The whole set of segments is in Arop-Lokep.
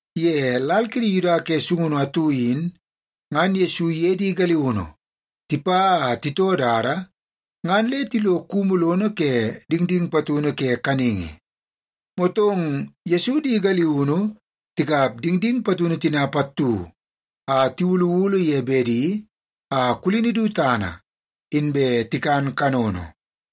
Ye lal kidi Yuda ke sungunu atu in, ngan Yesu iye di galiunu tipa a titoo dada, ngan le tilo kumu lono ke dingding patunu ke kaningi. Motong Yesu di galiunu tikap dingding patunu tina pattu a tiwuluwulu ye bedi a kulini du tana, inbe tikan kanono.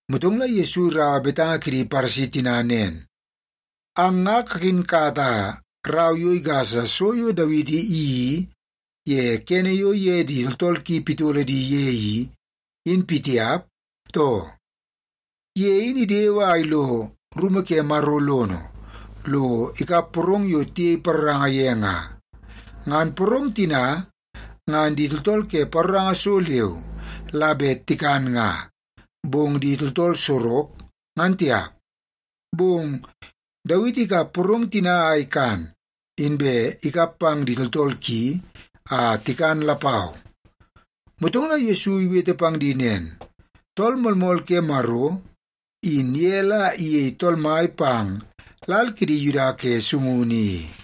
Motong la Yesu iraua betanga kidi Paresi tina nen, “Ang nga kakinkata rau yo igasa so yo Dawiti iyeii ye kene yo iye di tooltool ki pitolo di ye i, in pitiap, too? Ye in idewe a ilo rumu ke Maro lono, lo ikap porong yo tiyei paroranga ye nga. Ngan porong tina, ngan di tooltool ke paroranga so leu la bet tikan nga, bong di tooltool sorok, ngan tiap. Bong Dawiti ikap porong tina a ikan, inbe ikap pang di tooltool ki a tikan lapau.” Motong la Yesu iwete pang di nen, “Tool Moolmool ke Maro, in ye la iyei Tool Mai pang lal kidi Yuda ke sungunu i.”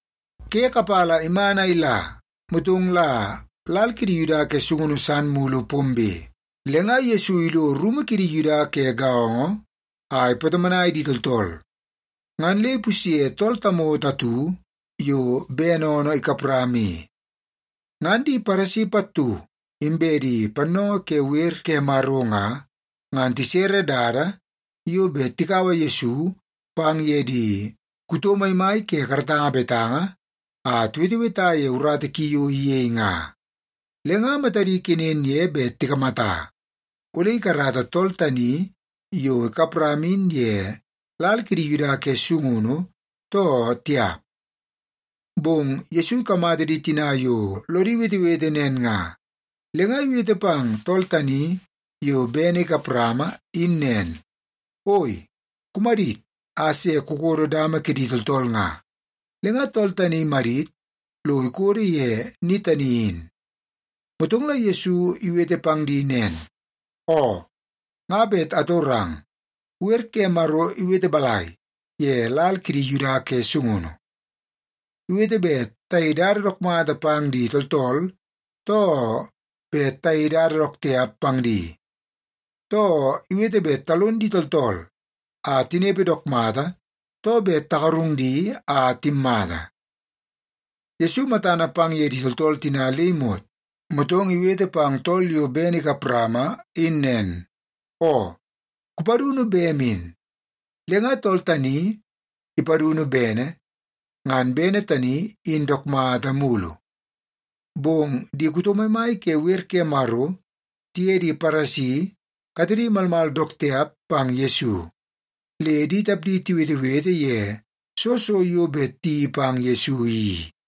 Ke kapala iman a ila, motong la lal kidi Yuda ke sungunu san mulu pombe. Le nga Yesu ilo rumu kidi Yuda ke gaongo a ipatomonai di tooltool. Ngan le ipusye tool tamoto atu yo bene oonoo ikap rama i. Ngan di Paresi pattu, inbe di pannoongoo ke wer ke Maro nga, ngan tisere dada yo bet tikaua Yesu pang ye di kuto maimai ke karatanga betanga a tiweteweta ye urata ki yo iyei nga. Le nga matadi kenen ye bet tikamata, ole ikarata tool tani yo ikap rama in ye lal kidi Yuda ke sungunu, too tiap. Bong Yesu ikamata di tina yo lodi wetewete nen nga, le nga iwete pang tool tani yo bene ikap rama in nen, “Oi, kumadit a se kukodo dama kidi tooltool nga.” Le nga tool tani imadit lo ikodo ye ni tani in. Motong la Yesu iwete pang di nen, “Oo, nga bet atorang. Wer ke Maro iwete balai ye lal kidi Yuda ke sungunu? Iwete bet tayei dada dook mata pang di tooltool, too bet tayei dada dook tiap pang di? Too, iwete bet talon di tooltool a tinepe dook mata, too bet tagarung di a timmata?” Yesu matana pang ye di tooltool tina le imot, motong iwete pang tool yo bene ikap rama in nen, “Oo, kupadunu bem in.” Le nga tool tani ipadunu bene, ngan bene tani in dook mata mulu. Bong di kuto maimai ke wer ke Maro tiye di Paresi katedi malmal dook tiap pang Yesu, le di tapdi tiwetewete ye soo so yo bet tiyeii pang Yesu i.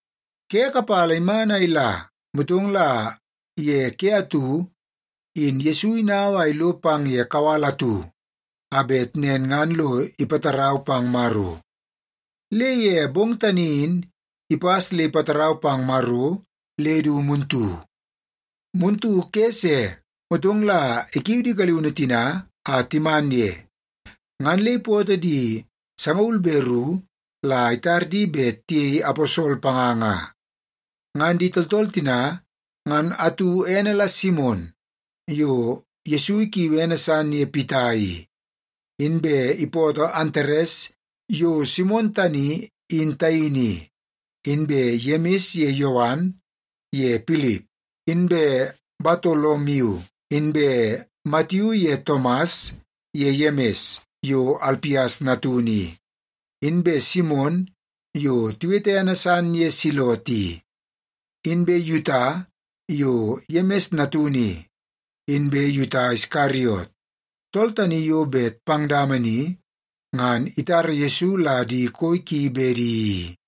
Ke kapala iman a ila, motong la ye ke atu in Yesu inau a ilo pang ye kawal atu a bet nen ngan lo ipatarau pang Maro. Le ye bong tani in ipas le ipatarau pang Maro le du muntu. Muntu ke se, motong la ikiu di galiunu tina a timan ye, ngan le ipootoo di sangaul be ru la itar di bet tiyei aposol panga nga. Ngan di tooltool tina ngan atu ene la Simon yo Yesu ikiui ene san ye Pita i. Inbe ipootoo Antares yo Simon tani in taini i, inbe Yemis ye Yowan ye Pilip, inbe Batolomiu, inbe Matiu ye Tomas ye Yemis yo Alpias natunu i, inbe Simon yo tiwete ene san ye Selot i, inbe Yuta yo Yemis natunu i, inbe Yuta Iskariot, tool tani yo bet pang dama ni ngan itara Yesu la di koi ki bedi i.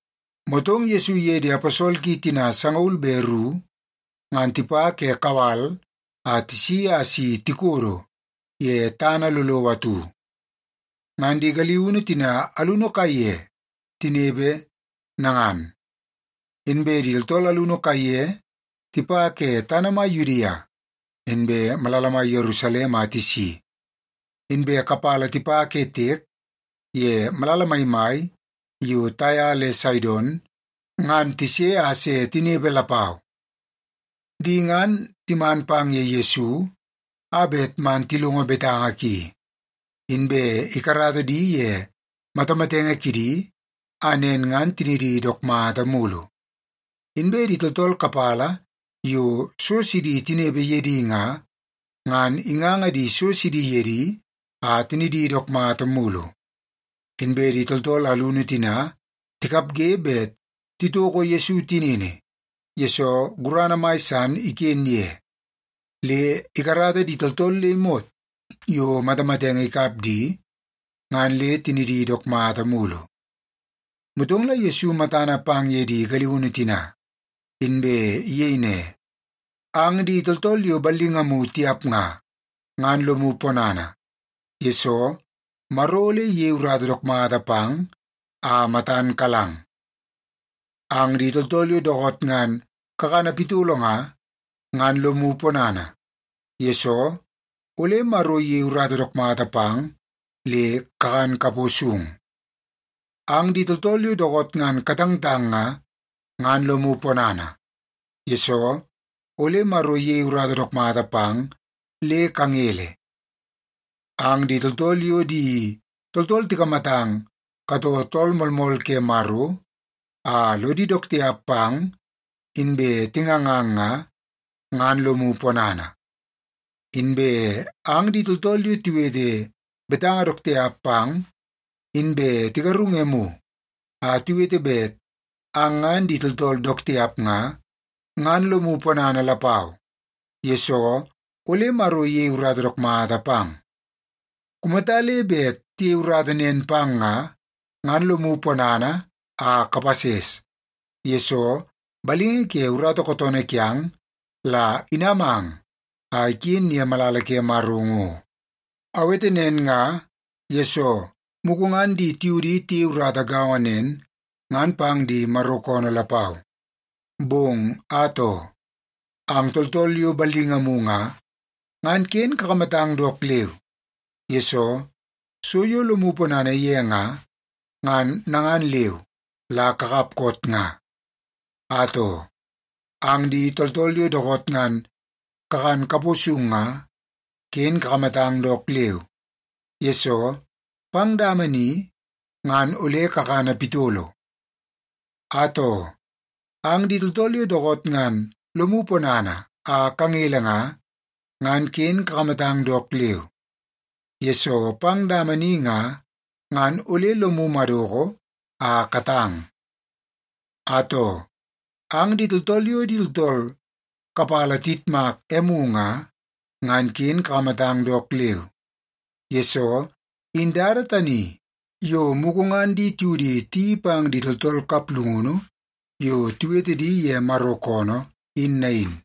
Motong Yesu iye di aposol ki tina sangaul be ru, ngan tipa ke kawal a tisi a si tikodo ye tana lolowo atu. Ngan di galiunu tina alunu kaiye tinepe nangan. Inbe di tooltool alunu kaiye tipa ke tana mai Yudia, inbe malala mai Yerusalem a tisi, inbe kapala tipa ke tiek ye malala maimai yo Taia le Saidon, ngan tise a se tinepe lapau. Di ngan timan pang ye Yesu a bet man tilongo betanga ki, inbe ikarata di ye matamatenge kidi a nen ngan tinidi dook mata mulu. Inbe di tooltool kapala yo so sidi tinepe ye di nga, ngan inganga so sidi ye di a tinidi dook mata mulu. Inbe di tooltool alunu tina tikapge bet titoko Yesu tinini, yesoo gurana mai san iken ye, le ikarata di tooltool le imot yo matamatenge ikap di, ngan le tinidi dook mata mulu. Motong la Yesu matana pang ye di galiunu tina, inbe iyei ne, “Ang di tooltool yo ballingamu tiap nga, ngan lomu ponana, yesoo Maro ole iyei urata dook mata pang a matan kalang. Ang di tooltool yo dookoot ngan kakana pitolo nga, ngan lomu ponana, yesoo ole Maro iyei urata dook mata pang le kakan kapo sung. Ang di tooltool yo dookoot ngan katangtang nga, ngan lomu ponana, yesoo ole Maro iyei urata dook mata pang le kangele. Ang di tooltool yo di tooltool tikamatang katoo Tool Moolmool ke Maro, a lodi dook tiap pang inbe tingangang nga, ngan lomu ponana. Inbe ang di tooltool yo tiwete betanga dook tiap pang, inbe tigarung emu a tiwete bet ang ngan di tooltool dook tiap nga, ngan lomu ponana lapau, yesoo ole Maro iyei urata dook mata pang. “Kumata le bet tiyei urata nen pang nga, ngan lomu ponana a kapases, yesoo balingi ke urata kootoonoo kiang la inamang a iken ye malala ke Maro ngo. Awete nen nga, yesoo mugu ngan di tiudi tiyei urata gaongo nen ngan pang di Maro koonoo lapau. Bong atoo, ang tooltool yo ballingamu nga, ngan ken kakamatang dook leu, yesoo so yo lomu ponana ye nga, ngan nangan leu la kakap koot nga. Atoo, ang di tooltool yo dookoot ngan kakan kapo sung nga, ken kakamatang dook leu, yesoo pang dama ni, ngan ole kakana pitolo. Atoo, ang di tooltool yo dookoot ngan lomu ponana a kangele nga, ngan ken kakamatang dook leu, yesoo pang dama ni nga, ngan ole lomu madoko a katang. Atoo, ang di tooltool yo di tooltool kapala tiyitmak emu nga, ngan ken kakamatang dook leu, yesoo in dada tani yo mugu ngan di tiudi tiyeii pang di tooltool kaplungunu yo tiwete di ye Maro koonoo, in nain.”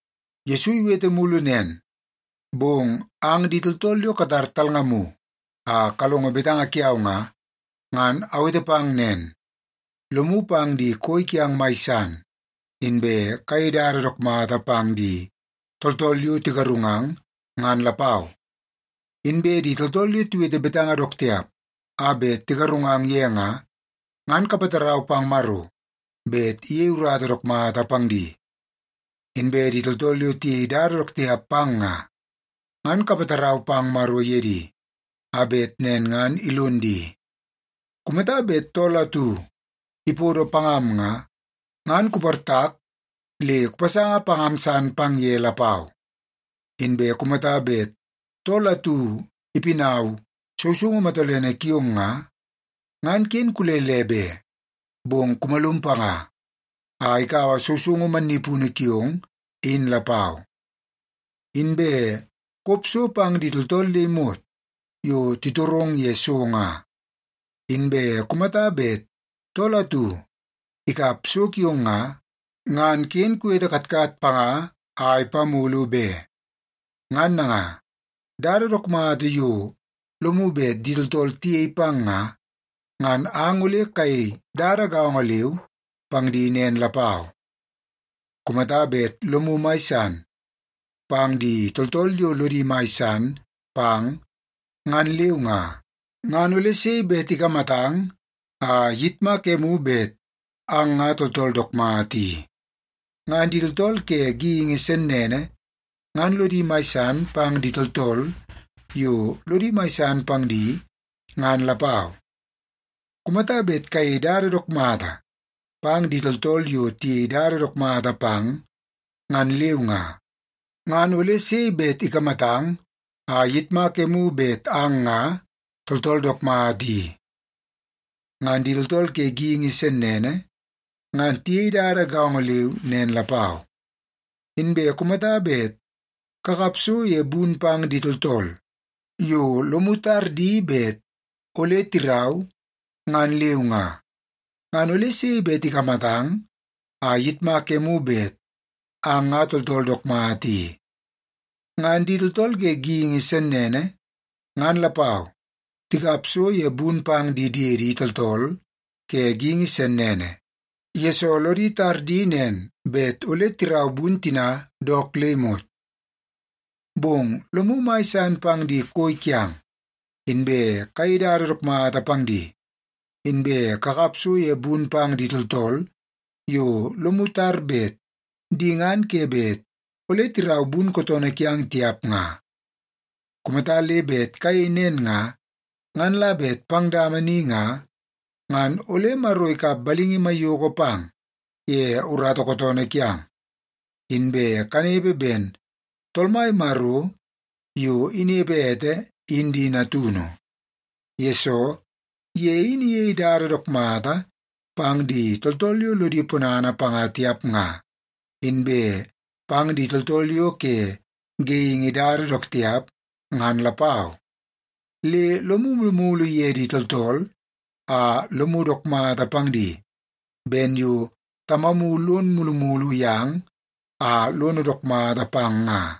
Yesu iwete mulu nen, “Bong ang di tooltool yo katar talngamu a kalongo betanga kiau nga, ngan awete pang nen, lomu pang di koi kiang mai san, inbe kayei dada dook mata pang di tooltool yo tigarungang, ngan lapau. Inbe di tooltool yo tiwete betanga dook tiap a bet tigarungang ye nga, ngan kapatarau pang Maro bet iyei urata dook mata pang di. Inbe di tooltool yo tiyei dada dook tiap pang nga, ngan kapatarau pang Maro ye di, a bet nen ngan ilon di. Kumata bet tool atu ipodo pangam nga, ngan kuportak le kupasanga pangam san pang ye lapau. Inbe kumata bet tool atu ipinau sousoungu matolene kiong nga, ngan ken kulele be, bong kumalum panga a ikaua sousoungu mannipunu kiong in lapau. Inbe kop so pang di tooltool le imot yo titorong ye so nga. Inbe kumata bet tool atu ikap so kiong nga, ngan ken kuwete katkat panga a ipamulu be. Ngan nanga, dada dook mata yo lomu bet di tooltool tiyei pang nga, ngan ang ole kayei dada gaongo leu pang di nen lapau. “Kumata bet lomu mai san pang di tooltool yo lodi mai san pang, ngan leu nga, ngan ole sei bet ikamatang a iyitmak emu bet ang nga tooltool dook mata i? Ngan di tooltool ke geingi sennene, ngan lodi mai san pang di tooltool yo lodi mai san pang di, ngan lapau. Kumata bet kayei dada dook mata pang di tooltool yo tiyei dada dook mata pang, ngan leu nga, ngan ole sei bet ikamatang a iyitmak emu bet ang nga tooltool dook mata i? Ngan di tooltool ke geingi sennene, ngan tiyei dada gaongo leu nen lapau. Inbe kumata bet kakap so ye bun pang di tooltool yo lomu tar di bet ole tirau, ngan leu nga, ngan ole sei bet ikamatang a iyitmak emu bet ang nga tooltool dook mata i? Ngan di tooltool ke geingi sennene, ngan lapau, tikap so ye bun pang di diedi tooltool ke geingi sennene, yesoo lodi tar di nen bet ole tirau bun tina dook le imot. Bong lomu mai san pang di koi kiang, inbe kayei dada dook mata pang di. Inbe kakap so ye bun pang di tooltool yo lomu tar bet di ngan ke bet ole tirau bun kootoonoo kiang tiap nga. Kumata le bet kayei nen nga, ngan la bet pang dama ni nga, ngan ole Maro ikap balingi maiyoko pang ye urata kootoonoo kiang, inbe kanepe ben Tool Mai Maro yo inepe ete in di natunu. Yesoo, ye in iyei dada dook mata pang di tooltool yo lodi ponana panga tiap nga, inbe pang di tooltool yo ke geingi dada dook tiap, ngan lapau. Le lomu mulumulu ye di tooltool a lomu dook mata pang di ben yo Tamamu lono mulumulu yang a lono dook mata pang nga.”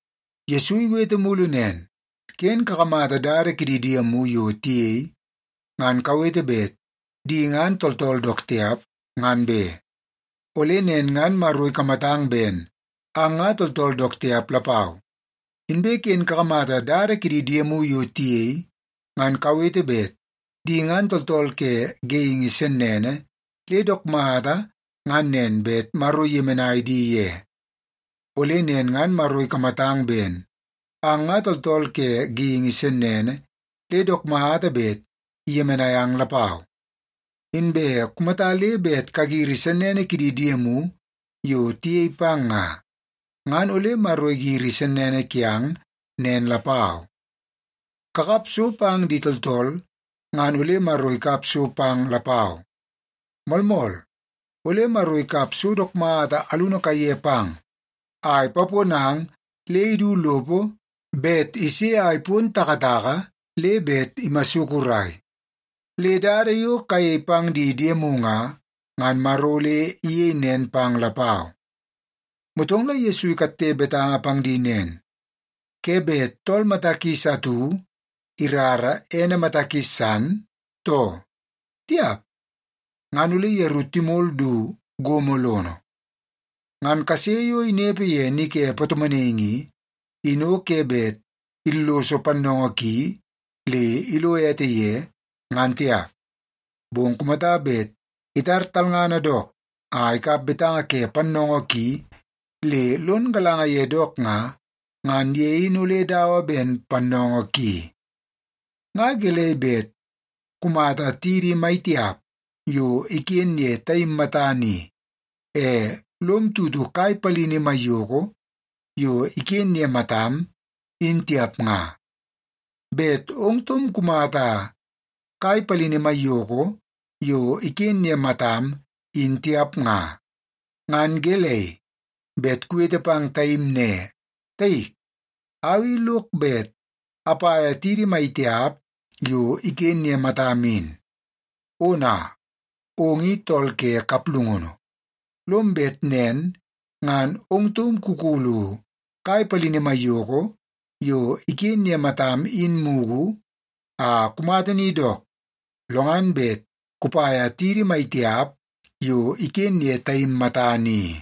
Yesu iwete mulu nen, “Ken kakamata dada kidi diemu yo tiyei, ngan kawete bet di ngan tooltool dook tiap, ngan be. Ole nen ngan Maro ikamatang ben ang nga tooltool dook tiap lapau. Inbe ken kakamata dada kidi diemu yo tiyei, ngan kawete bet di ngan tooltool ke geingi sennene le dook mata ngan nen bet Maro iyemenai di ye. Ole nen ngan Maro ikamatang ben ang nga tooltool ke geingi sennene le dook mata bet iyemenai ang lapau. Inbe kumata le bet kagiri sennene kidi diemu yo tiyei pang nga, ngan ole Maro igiri sennene kiang nen lapau. Kakap so pang di tooltool ngan ole Maro ikap so pang lapau. Moolmool, ole Maro ikap so dook mata alunu kaiye pang a ipaponang le idu lopo bet ise a ipon takataka le bet imasukurai. Le dada yo kayei pang di diemu nga, ngan Maro ole iyei nen pang lapau.” Motong la Yesu ikatte betanga pang di nen, “Ke bet tool mata kis atu irara ene mata kis san, too? Tiap! Ngan ole yeru timol du gomo lono. Ngan kase yo inepe ye ni ke patomonaingi i, in o ke bet illoso pannoongoo ki le ilo ete ye, ngan tiap. Bong kumata bet itar talngana dook a ikap betanga ke pannoongoo ki le lon galanga ye dook nga, ngan ye in ole dawa ben pannoongoo ki. “Nga gelei bet kumata tidi maitiap yo iken ye taim matana i, e lom tutu kai palini maiyoko yo iken ye matam, in tiap nga? Bet ong taum kumata kai palini maiyoko yo iken ye matam, in tiap nga, ngan gelei bet kuwete pang taim ne, ‘Taik, au i lok bet apaia tidi maitiap yo iken ye matam in.’ Ona, ong in tool ke kaplungunu! Lom bet nen ngan ong taum kukulu kai palini maiyoko yo iken ye matam in mugu a kumata ni dook, lo ngan bet kupaia tidi maitiap yo iken ye taim matana i.”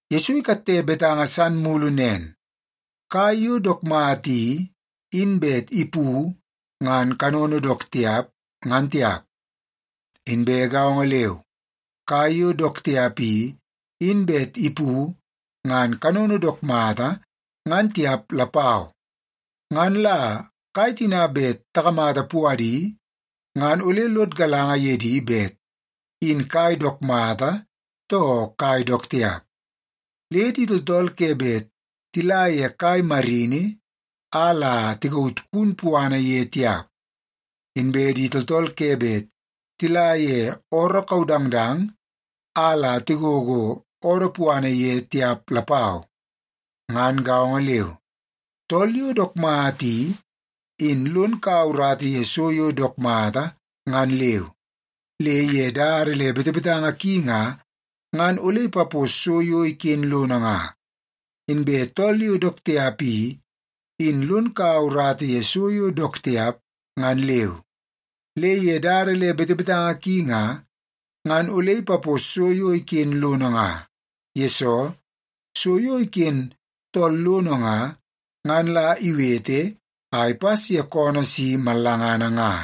Yesu ikatte betanga san mulu nen, “Kai yo dook mata i, in bet ipu ngan kanono dook tiap, ngan tiap. Inbe gaongo leu, kai yo dook tiap i, in bet ipu ngan kanono dook mata, ngan tiap lapau. Ngan la kai tina bet takamata puadi, ngan ole lod galanga ye di bet in kai dook mata, too kai dook tiap. Le di tooltool ke bet tila ye kai marini, a la tikaut kun puana ye tiap. Inbe di tooltool ke bet tila ye ooroo kaudangdang, a la tigogo oodoo puana ye tiap lapau. Ngan gaongo leu, tool yo dook mata i, in lon kaua urata ye so yo dook mata ngan leu, le ye dada le betebetanga ki nga, ngan ole ipapos so yo iken lono nga. Inbe tool yo dook tiap i, in lon kaua urata ye so yo dook tiap ngan leu, le ye dada le betebetanga ki nga, ngan ole ipapos so yo iken lono nga. Yesoo, so yo iken tool lono nga, ngan la iwete a ipas ye koonoo si mallangana nga.”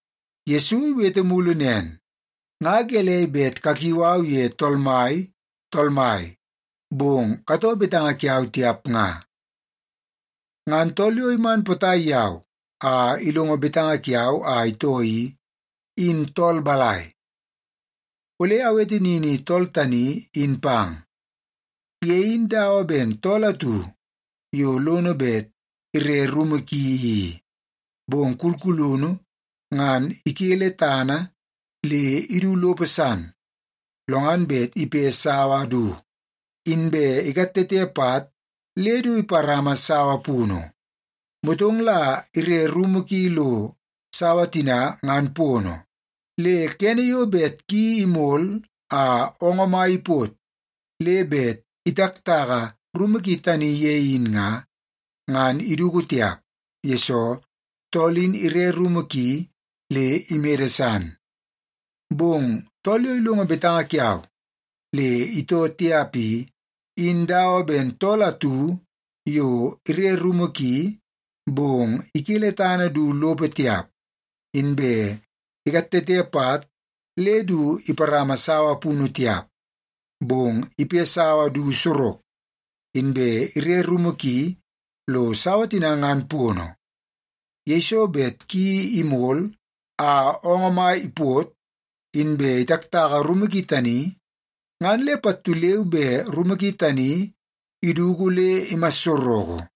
Yesu iwete mulu nen, “Nga gelei bet kakiu au ye ‘Tool Mai, Tool Mai,’ bong katoo betanga kiau tiap nga? Ngan tool yo iman potai yau a ilongo betanga kiau a itoo i, in tool balai? Ole awete nini tool tani in pang. Ye in dawa ben tool atu yo lono bet ire rumu ki i. Bong kulkulunu ngan ikele tana le idu lopo san, lo ngan bet ipe sawa du, inbe ikatete pat le du iparama sawa punu. Motong la ire rumu ki lo sawa tina ngan pono. Le kene yo bet ki imol a oongoo mai ipot le bet itaktaka rumu ki tani ye in nga, ngan iduku tiap, yesoo tool in ire rumu ki le imede san. Bong tool yo ilongo betanga kiau le itoo tiap i, in dawa ben tool atu yo ire rumu ki, bong ikele tana du lopo tiap, inbe ikatete pat le du iparama sawa punu tiap. Bong ipe sawa du sorok, inbe ire rumu ki lo sawa tina ngan pono. Yeiso bet ki imol a oongoo mai ipot, inbe itaktaka rumu ki tani, ngan le pattu leu be rumu ki tani iduku le imassoroko.”